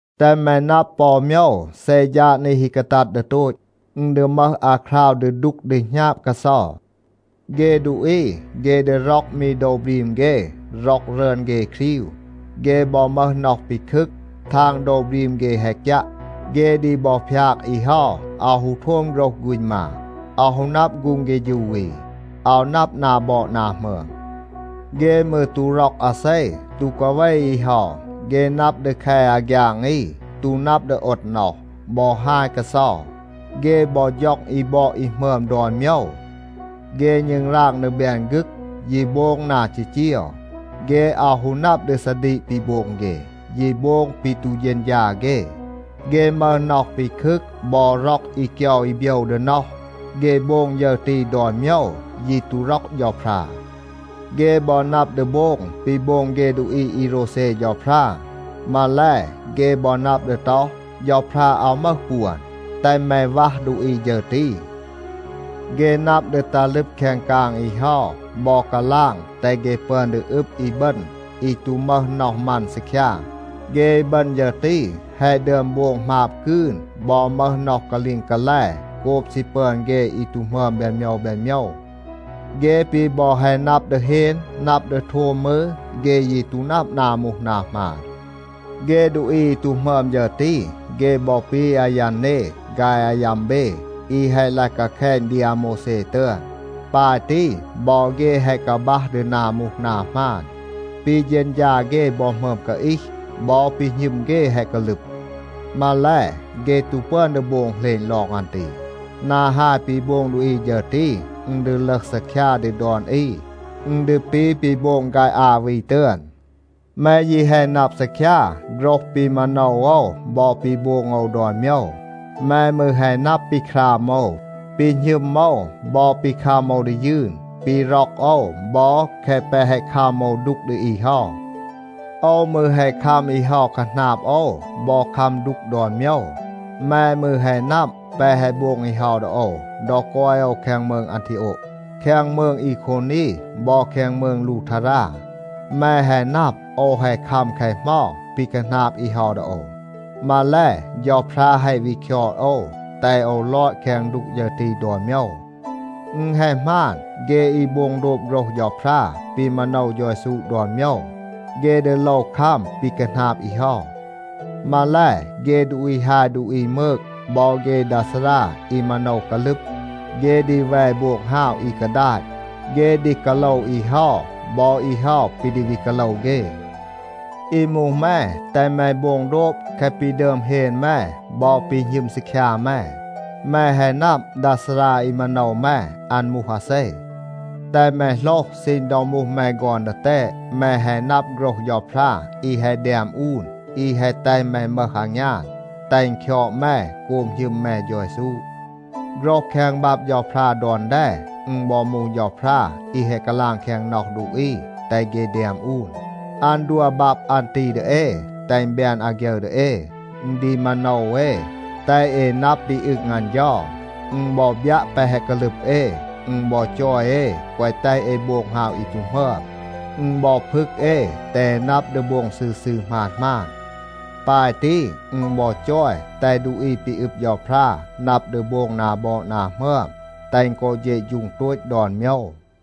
แตห แม นับ ปอ โมยว. เซ ฌาด นี ฮี กาตัด ดี โตต, อึณ ดี มึห อาคราว ดี ดูก ดี หณาบ กาเซา. เฆ ดูอี, เฆ ดี ร็อก มี โดว บรีม เฆ, ร็อก รึอน เฆ ครีว. เฆ บอ มึห น็อห ปีคึก, ทาง โดว บรีม เฆ แฮะ กยัะ. เฆ ดี บอ พยาก อี เฮา, อาว ฮู โทม โฆรห ฆูณ มา, อาว ฮู นับ ฆูง เฆฌู อี, อาว นับ นา บอด นา หมึอม. เฆ มืร ตู ร็อก อาเซ, ตู กาเว อี เฮา. เฆ นับ ดี แค อาฆยาง อี, ตู นับ ดี โอด น็อห, บอ ฮาย กาเซา. เฆ บอ ฌ็อง อี บอด อี หมึอม ดอน โมยว. เฆ ณึงราง ดี แบน ฆึก, ยี โบง นา จีจีว. เฆ อาว ฮู นับ ดี ซาดีก ปี โบง เฆ, ยี โบง ปี ตู เฌณฌา เฆ. เฆ มึห น็อห ปีคึก บอ ร็อก อี เกยา อี โบยว ดี น็อห. เฆ โบง ฌึร ตี ดอน โมยว, ยี ตู ร็อก เฌาพรา. เฆ บอ นับ ดี โบง ปี โบง เฆ ดูอี อี โรวเซ เฌาพรา. มาแล, เฆ บอ นับ ดี ต็อห, เฌาพรา อาว มึห ปวน. แตห แม วัห ดูอี ฌึร ตี. เฆ นับ ดี ตัห ลึบ แคง กาง อี เฮา บอ กาลาง แตห เฆ ปึอน ดี อึบ อีบึณ อี ตู มึห น็อห มัน ซีคยา. เฆ อีบึณ ฌึร ตี แฮะ ดึอม โบง หมาบ กืน บอ มึห น็อห กาลีง กาแล โกบ ซี ปึอน เฆ อี ตู หมึอม แบน โมยว แบน โมยว. เฆ ปี บอ แฮะ นับ ดี เฮน, นับ ดี โทม มืร, เฆ ยี ตู นับ นา มูห นา หมาน. เฆ ดูอี อี ตู หมึอม ฌึร ตี, เฆ บอ ปี อายันเน ฆาย อายัมเบ อี แฮะ ลาย กาแคณ ดี อาโมวแซ ตึอน. ปาย ตี บอ เฆ แฮะ กาบัห ดี นา มูห นา หมาน. ปี เฌณฌา เฆ บอ หมึอม กาอีห. บอ ปี หณึม เฆ แฮะ กาลึบ. มาแล, เฆ ตู ปึอน ดี โบง เหลณ ลอง อัน ตี. นา ฮาย ปี โบง ดูอี ฌึร ตี, อึณ ดี ลึห ซีคยา ดี ดอน อี. อึณ ดี ปี ปี โบง ฆาย อา วี ตึอน. แม ยี แฮะ นับ ซีคยา โฆรห ปี มาโนว โอว บอ ปี โบง โอว ดอน โมยว. แม มืร แฮะ นับ ปี คราม โอว, ปี หณึม โอว บอ ปี คัม โอว ดี ยืน, ปี ร็อก โอว บอ แคะ แปะ แฮะ คัม โอว ดูก ดี อี เฮา. โอว มืร แฮะ คัม อี เฮา คาหนาบ โอว บอ คัม ดูก ดอน โมยว. แม มืร แฮะ นับ แปะ แฮะ โบง อี เฮา ดี โอว ดอ กอย โอว แคง มืง อันทีโอะ, แคง มืง อีโควนี บอ แคง มืง ลูทารา. แม แฮะ นับ โอว แฮะ คัม แคะ เหมา ปี คาหนาบ อี เฮา ดี โอว. มาแล, เฌาพรา แฮะ วี คยอด โอว, แตห โอว ลอด แคง ดูก ฌึร ตี ดอน โมยว. อึณ แฮะ หมาน, เฆ อี โบง โดบ โฆรห เฌาพรา ปี มาโนว เฌา เยซู ดอน โมยว, เฆ ดี โลว คัม ปี คาหนาบ อี เฮา. มาแล, เฆ ดูอี ฮาย ดูอี มืก บอ เฆ ดา ซารา อี มาโนว กาลึบ, เฆ ดี แว โบง ฮาว อี กาดาต. เฆ ดี กาโลว อี เฮา, บอ อี เฮา ปี ดี วี กาโลว เฆ. อี มูห แม, แตห แม โบง โดบ แคะ ปี ดึอม เฮน แม บอ ปี หณึม ซีคยา แม. แม แฮะ นับ ดา ซารา อี มาโนว แม, อัน มูห อาเซ. แตห แม โหลห, ซีณ ดอ มูห แม ฆอน ดีแตด, แม แฮะ นับ โฆรห เฌาพรา อี แฮะ แดม อูน, อี แฮะ แตห แม มึห อางยาน, แตห อึณ คยอด แม โกบ หณึม แม เฌา เยซู. โฆรห แคง บับ เฌาพรา ดอน แด, อึณ บอ มูห เฌาพรา อี แฮะ กาลาง แคง น็อห ดูอี, แตห เฆ แดม อูน. อัน ดัว บับ อัน ตี ดี เอ, แตห อึณ แบน อาฆยึร ดี เอ. อึณ ดี มาโนว เอ, แตห เอ นับ ปี อึง อัน เฌา. อึณ บอ บยัะ แปะ แฮะ กาลึบ เอ. อึณ บอ จอย เอ แกวะ แตห เอ โบง ฮาว อี ตู หมึอม. อึณ บอ พึก เอ, แตห เอ นับ ดี โบง ซืร ซืร หมาน หมาน. ปาย ตี, อึณ บอ จอย แตห ดูอี ปี อึบ เฌาพรา นับ ดี โบง นา บอด นา หมึอม, แตห อึณ กอ เฌะฌูง โตต ดอน โมยว.